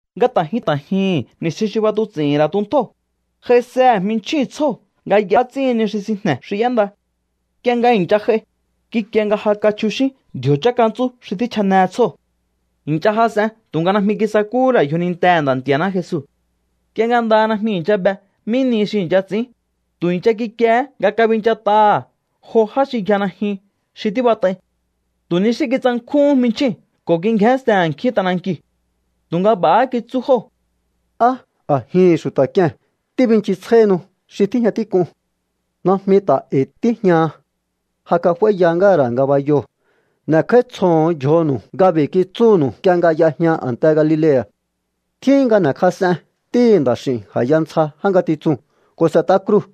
Nga ta̱ jyun ta̱ jyuhu̱n ni̱stjin xi b'atuts'i̱hi̱n ra̱ tuntjóo̱, j'aisehe̱ jminchjíu̱n tsjóo̱ nga y'a ts'íhin ni xi sinjne̱ xi y'énda. Nk'ie nga i̱ncha j'ai, kikie nga ja kachjuxín ndji̱o̱ chákantsú xi tjíchjane tsjóo̱. I̱ncha jas'en tu̱nga najmi kisakúhú ra̱ yjonintehe̱ Nda̱ Nti̱a̱ná Jesu. Nk'ie nga ndaha najmi i̱ncha be mí nihi xi i̱ncha ts'i̱ín, tu̱ i̱ncha kikiehé nga kabinchat'aha̱ jo já xi yja najyun xi tíbat'ai. Tu̱ ni xí kitsankjúhún jminchjíu̱n ko̱ kingjénsten a̱nkjín t'anankiu̱. Tu̱nga b'a̱há kitsú jóo̱: —¿Á a̱jihi̱n xu̱ta̱ k'ie̱n tíbinchisjáíhinu xi tíjña tík'un? Najmi ta̱ e̱i̱ tíjñaha. Ja kaf'áíya ngáha̱ ra̱ ngabayoo̱. N'e̱kj'áítsjoho̱on yjonu̱u nga b'i̱ kitsúnu̱u nk'ie nga y'ejña a̱nte Galilea̱: “Tjíhin nga n'e̱kjas'en Ntíhi̱ Nda̱x'i̱u̱n a̱ya ntsja já ngatitsuu̱n ko̱ s'e̱t'a kruu̱.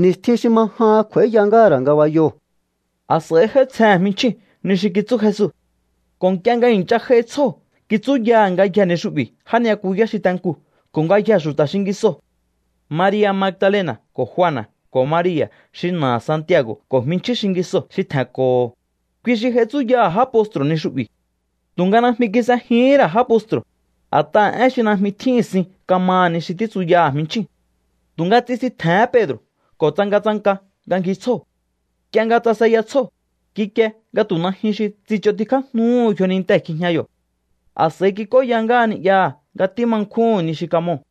Ni̱stjin xi ma jahan kj'u̱a̱íya ngáha̱ ra̱ ngabayoo̱.” A̱s'a̱i j'áítsjehe̱n jminchjíu̱n ni xi kitsú Jesu ko̱ nk'ie nga i̱ncha j'aihi tsjóo̱ kitsúyaha̱ ngayjee̱ ni xu'bi̱ já ni'yakuyá xi te nkuu̱ ko̱ ngayjee̱ xu̱ta̱ xingisoo̱. Maria̱ Magdalena̱ ko̱ Juana̱ ko̱ Maria̱ xi na̱aha̱ Santiago̱ ko̱ jminchjín xingisoo̱ xi tje̱nko̱ho̱, kui xi j'ai tsúyaha̱ já postru̱ ni xu'bi̱. Tu̱nga najmi kis'ejihín ra̱ já postru̱, a̱t'aha̱ én xi najmi tjíhi̱n sin kamaha̱ ni xi títsuya jminchjíu̱n. Tu̱nga tsisintje̱hén Pedro̱ ko̱ tsangatsanka nga ngji tsjóo̱. Nk'ie nga tsaseya tsjóo̱, kikie nga tu̱ najyun xi tsich'ontikjájnuhú yjonintee̱ kjijña yo̱. A̱s'a̱i kik'óya ngáha ni'yaha̱ nga tíma nkjúhu̱n ni xi kamoo̱.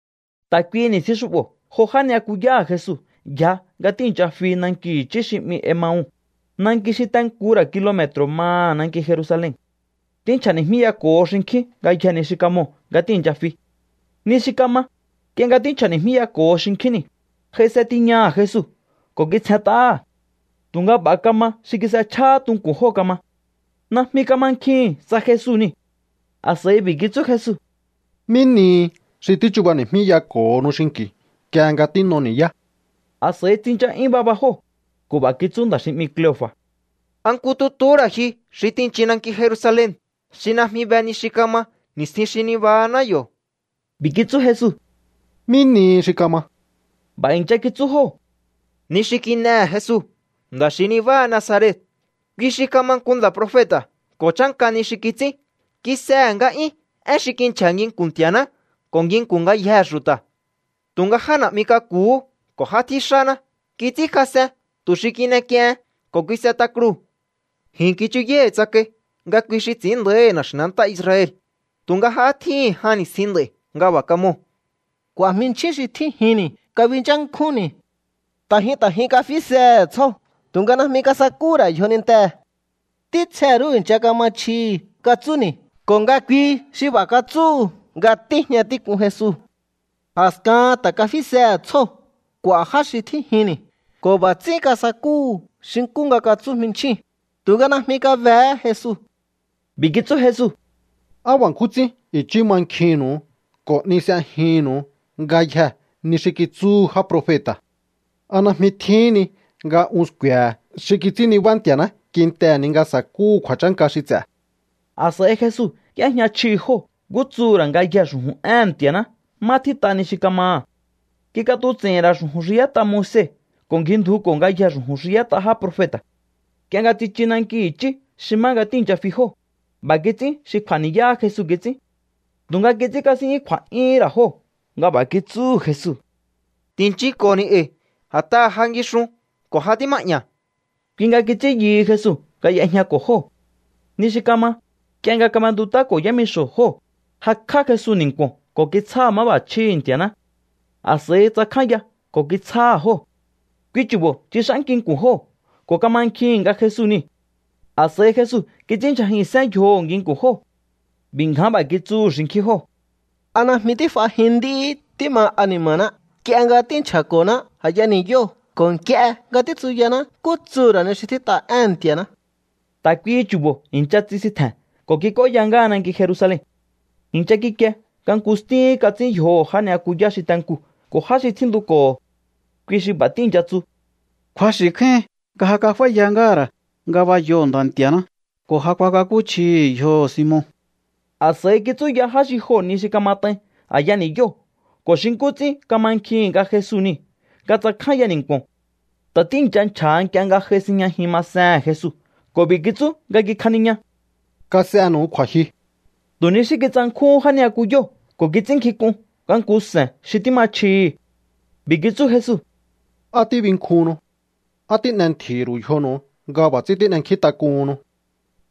Ta̱ kuihi ni̱stjin xu'bo̱ jo já ni'yakuyáha̱ Jesu yja nga tíi̱ncha fi nanki i̱chí xi 'mi Emau, nanki xi te nku ra̱ kilome̱tro̱ maha̱ nanki Jerusalen. Tínchja̱ni̱jmíyako̱ho xinkjín ngayjee̱ ni xi kamoo̱ nga tíi̱ncha fi. Ni xi kama, nk'ie nga tínchja̱ni̱jmíyako̱ho xinkjín niu̱, j'aise tiñaha̱ Jesu ko̱ kitsjent'áha̱. Tu̱nga b'a̱ kama xi kis'echjahá tunku̱n jóo̱ kama. Najmi kamankjihi̱n tsa Jesu niu̱. A̱s'a̱i b'i̱ kitsú Jesu: —¿Mí nihi xi tíchubani̱jmíyako̱honu xinki̱u nk'ie nga tín'o ni̱yá? A̱s'a̱i tsincha'yún baba jóo̱ ko̱ b'a̱ kitsú nda̱ xi 'mi Cleofa̱: —¿A nku tutu ra̱ ji xi tinchin nanki Jerusalen xi najmi be ni xi kama ni̱stjin xi nibahaná yo̱? B'i̱ kitsú Jesu: —¿Mí nihi xi kama? B'a̱ i̱ncha kitsú jóo̱: —Ni xi kin'ehe̱ Jesu, nda̱ xi nibáha Nazaret. Kui xi kama nku nda̱ profeta̱ ko̱ chánka ni xi kits'ín. Kis'ehe̱ nga'yún én xi kinchja̱ nginku̱n Nti̱a̱ná ko̱ nginku̱n ngayjee̱ xu̱ta̱. Tu̱nga já na̱'mi k'aku̱hú ko̱ já tjíxáná kits'ínkjas'en tu̱ xi kin'ek'iehen, ko̱ kis'et'a kruu̱. Ji̱n kichuyái̱ tsakai nga kui xi ts'i̱ín nda̱íhi̱ na̱xi̱nantá Israel. Tu̱nga ja tjíhi̱n jan ni̱stjin nd'a̱i̱ nga b'a̱ kamoo̱. ’K'u̱a̱ jminchjín xi tjínjinni̱ kabinchánkjúnni̱. Ta̱ jyun ta̱ jyun kafisehe̱ tsjóo̱, tu̱nga najmi kasakúhú ra̱ yjonintee̱. Ntítsje rú i̱ncha kama chjihi̱ katsúni̱ ko̱ nga kui xi b'a̱ katsúhu̱ nga tíjña tík'un Jesu. A̱skahan ta̱ kafisehe̱ tsjóo̱ k'u̱a̱ já xi tjínjinni̱ ko̱ b'a̱ ts'ín kasakúhu̱ xi nkú nga katsú jminchjíu̱n, tu̱nga najmi kabehé Jesu. B'i̱ kitsú Jesu: —¡Á b'a̱ nkjún ts'ín i̱chí mankjihi̱nnu̱u ko̱ 'ni s'ejihi̱nnu̱u ngayjee̱ ni xi kitsúhu já profeta̱! ¿A najmi tjíhin ni nga un sku̱e̱he̱ xi kits'ín nibá Nti̱a̱ná kintehe̱ ni nga sa̱kúhu̱ kju̱a̱chánka xi ts'e̱? A̱s'a̱i Jesu y'éjña chjihi̱ jóo̱ nkú tsuhu̱ ra̱ ngayjee̱ xu̱ju̱n éhe̱n Nti̱a̱ná má tjít'a ni xi ka̱maha̱. Kik'atuts'i̱hi̱n ra̱ xu̱ju̱n xi y'ét'a Moise ko̱ ngjindjuko̱ ngayjee̱ xu̱ju̱n xi y'ét'a já profeta̱. Nk'ie nga tsichu nanki i̱chí xi má nga tíi̱ncha fi jóo̱, b'a̱ kits'ín xi kj'u̱a̱ ni̱yá Jesu kits'ín. Tu̱nga kits'ínkasín'yún kju̱a̱'yúhún ra̱ jóo̱ nga b'a̱ kitsúhu̱ Jesu: —Ti̱nchinko̱ni̱ e̱i̱, a̱t'aha̱ ja ngixun ko̱ ja tíma'ña̱. Kui nga kits'ín yuhu Jesu nga y'ejñako̱ jóo̱. Ni xi kama, nk'ie nga kab'entut'áko̱ yámixo̱ jóo̱, jakj'á Jesu ni̱nku̱o̱n ko̱ kitsjáha̱ máb'a̱chjíhi̱ Nti̱a̱ná. A̱s'a̱i tsakjánya ko̱ kitsjáha̱ jóo̱. Kui chu̱bo̱ tsix'ánki nku̱n jóo̱ ko̱ kamankjihi̱n nga Jesu niu̱. A̱s'a̱i Jesu kits'ínndyjajihi̱nsén yjoho̱ nginku̱n jóo̱. B'i̱ ngján b'a̱ kitsúhu̱ xinkjín jóo̱: —¿A najmi tíf'ajin nd'íhí tíma ani̱ma̱ná nk'ie nga tínchja̱ko̱ná a̱ya ni̱yóo̱ ko̱ nk'ie nga títsuyaná nkú tsuhu̱ ra̱ ni xi tjít'a éhe̱n Nti̱aná? Ta̱ kuihi chu̱bo̱ i̱ncha tsisintje̱n ko̱ kik'óya ngáha nanki Jerusalen. I̱ncha kikie nga nku stíhín kats'ín yjoho̱ já ni'yakuyá xi te nkuu̱ ko̱ já xi tjíntuko̱ho̱. Kui xi b'a̱ tíi̱ncha tsu: —Kju̱axi̱ kjáíhin nga ja kaf'áíya ngáha̱ ra̱ ngabayoo̱ Nda̱ Nti̱a̱ná ko̱ ja kuakakúchjihi̱ yjoho̱ Simon. A̱s'a̱i kitsúya já xi joo̱ ni xi kamat'ain a̱ya ni̱yóo̱ ko̱ xi nkú ts'ín kamankjihi̱n nga Jesu niu̱ nga tsakjánya ni̱nku̱o̱n. Ta̱ tíi̱ncha nchja̱ha nk'ie nga j'ai sinjñajin masehe̱n Jesu ko̱ b'i̱ kitsú nga kikjaniña: —Kas'enu̱u kju̱a̱jyu. Tu̱ ni xí kitsankjúhún já ni'yakuyóo̱ ko̱ kits'ínnkjink'un nga nku se̱n xi tíma chjihi̱. B'i̱ kitsú Jesu: —¿Á tíbinkjuhunnu? ¿Á tín'entji̱hi̱ ru̱u yjonu̱u nga b'a̱ ts'ín tín'enkjíntak'uhunnu?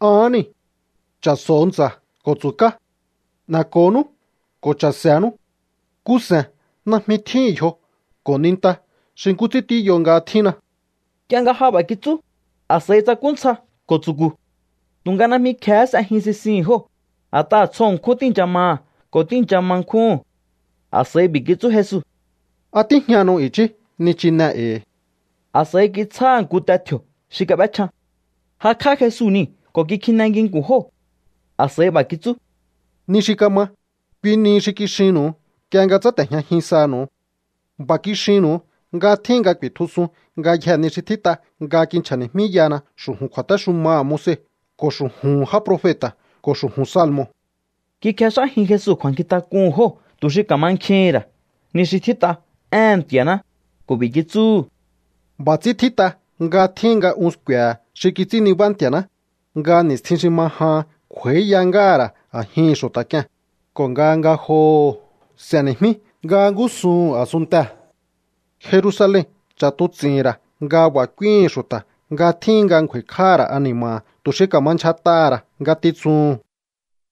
Ahán niu̱. Cha̱so̱o ntsa̱ ko̱ tsu̱ká. N'e̱ko̱nú ko̱ cha̱se̱nú. Nku se̱n najmi tjíhi̱n yjo ko̱ ninta xi nkú ts'ín tíyo nga tjínna. Nk'ie nga ja b'a̱ kitsú, a̱s'a̱i tsakú ntsja ko̱ tsu̱ku̱. Tu̱nga najmi kje̱hé s'ejin sisihi̱n jóo̱, a̱t'aha̱ tsjo ṉkjún tíi̱ncha maha̱ ko̱ tíi̱ncha ma nkjúhu̱n. A̱s'a̱i b'i̱ kitsú Jesu: —¿A tíjñanu̱u i̱chí nichine e̱i̱? A̱s'a̱i kitsjáha̱ nku te tji̱o̱ xi kab'échjan. Jakj'á Jesu niu̱ ko̱ kikjine nginku̱n jóo̱. A̱s'a̱i b'a̱ kitsú: —Ni xi kama, kui nihi xi kixinnu̱u nk'ie nga tsáte̱jñajin sanu̱u. B'a̱ kixinnu̱u nga tjíhin nga ku̱i̱tjusun ngayjee̱ ni xi tjít'a nga kinchja̱ni̱jmíyahana xu̱ju̱n kju̱a̱téxumaha̱ Moise ko̱ xu̱ju̱hu̱n já profeta̱ ko̱ xu̱ju̱n salmo̱. Kikjex'ájin Jesu kju̱a̱nkjintak'uhu̱n jóo̱ tu̱ xi ka̱mankjihi̱n ra̱ ni xi tjít'a éhe̱n Ntianá ko̱ b'i̱ kitsúhu̱: —B'a̱ ts'ín tjít'a nga tjíhin nga un sku̱e̱he̱ xi kits'ín nibá Nti̱a̱ná, nga ni̱stjin xi ma jahan kj'u̱a̱íya ngáha̱ ra̱ a̱jihi̱n xu̱ta̱ k'ie̱n, ko̱ nga ngajoho̱ s'e̱ni̱jmí nga ngúsuhu̱n a̱sunntee̱. Jerusalen ch'a̱tuts'i̱hi̱n ra̱ nga b'a̱ k'úíhi̱n xu̱ta̱ nga tjíhin nga ngju̱a̱i̱kj'áha̱ ra̱ ani̱ma̱ha̱ tu̱ xi ka̱ma ndyjat'aha̱ ra̱ ngatitsuhun.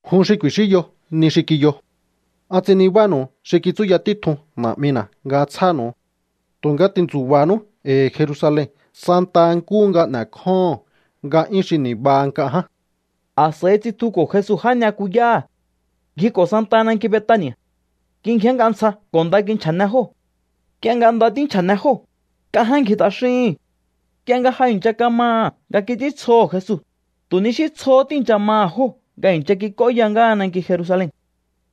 Jun xi ku̱i̱xínyo ni xi kiyo. An ts'in nibánu̱u xi kitsúya títjun Na̱'mina̱ nga tsjánu̱u. Tu̱nga ti̱ntsu̱ba̱nú e̱i̱ Jerusalen santa nkúhu nga n'e̱kjóho̱on nga'yún xi ni̱baha nk'a ján. A̱s'a̱i tsitjuko̱ Jesu já ni'yakuyáha̱. Ngjiko̱ santaha nanki Betani̱a̱. Kingjénnk'a ntsja ko̱ nda kinchja̱ne jóo̱. Nk'ie nga nda tínchja̱ne jóo̱, nk'a ján ngji t'axíhi̱n. Nk'ie nga ja i̱ncha kamaha̱ nga kits'íntsjoho̱ Jesu, tu̱ ni xí tsjohó tíi̱ncha maha̱ jóo̱ nga i̱ncha kik'óya ngáha nanki Jerusalen.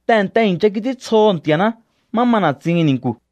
Tehe̱nte i̱ncha kits'íntsjoho̱ Nti̱a̱ná má ma na̱tsihi̱n ni̱nku̱.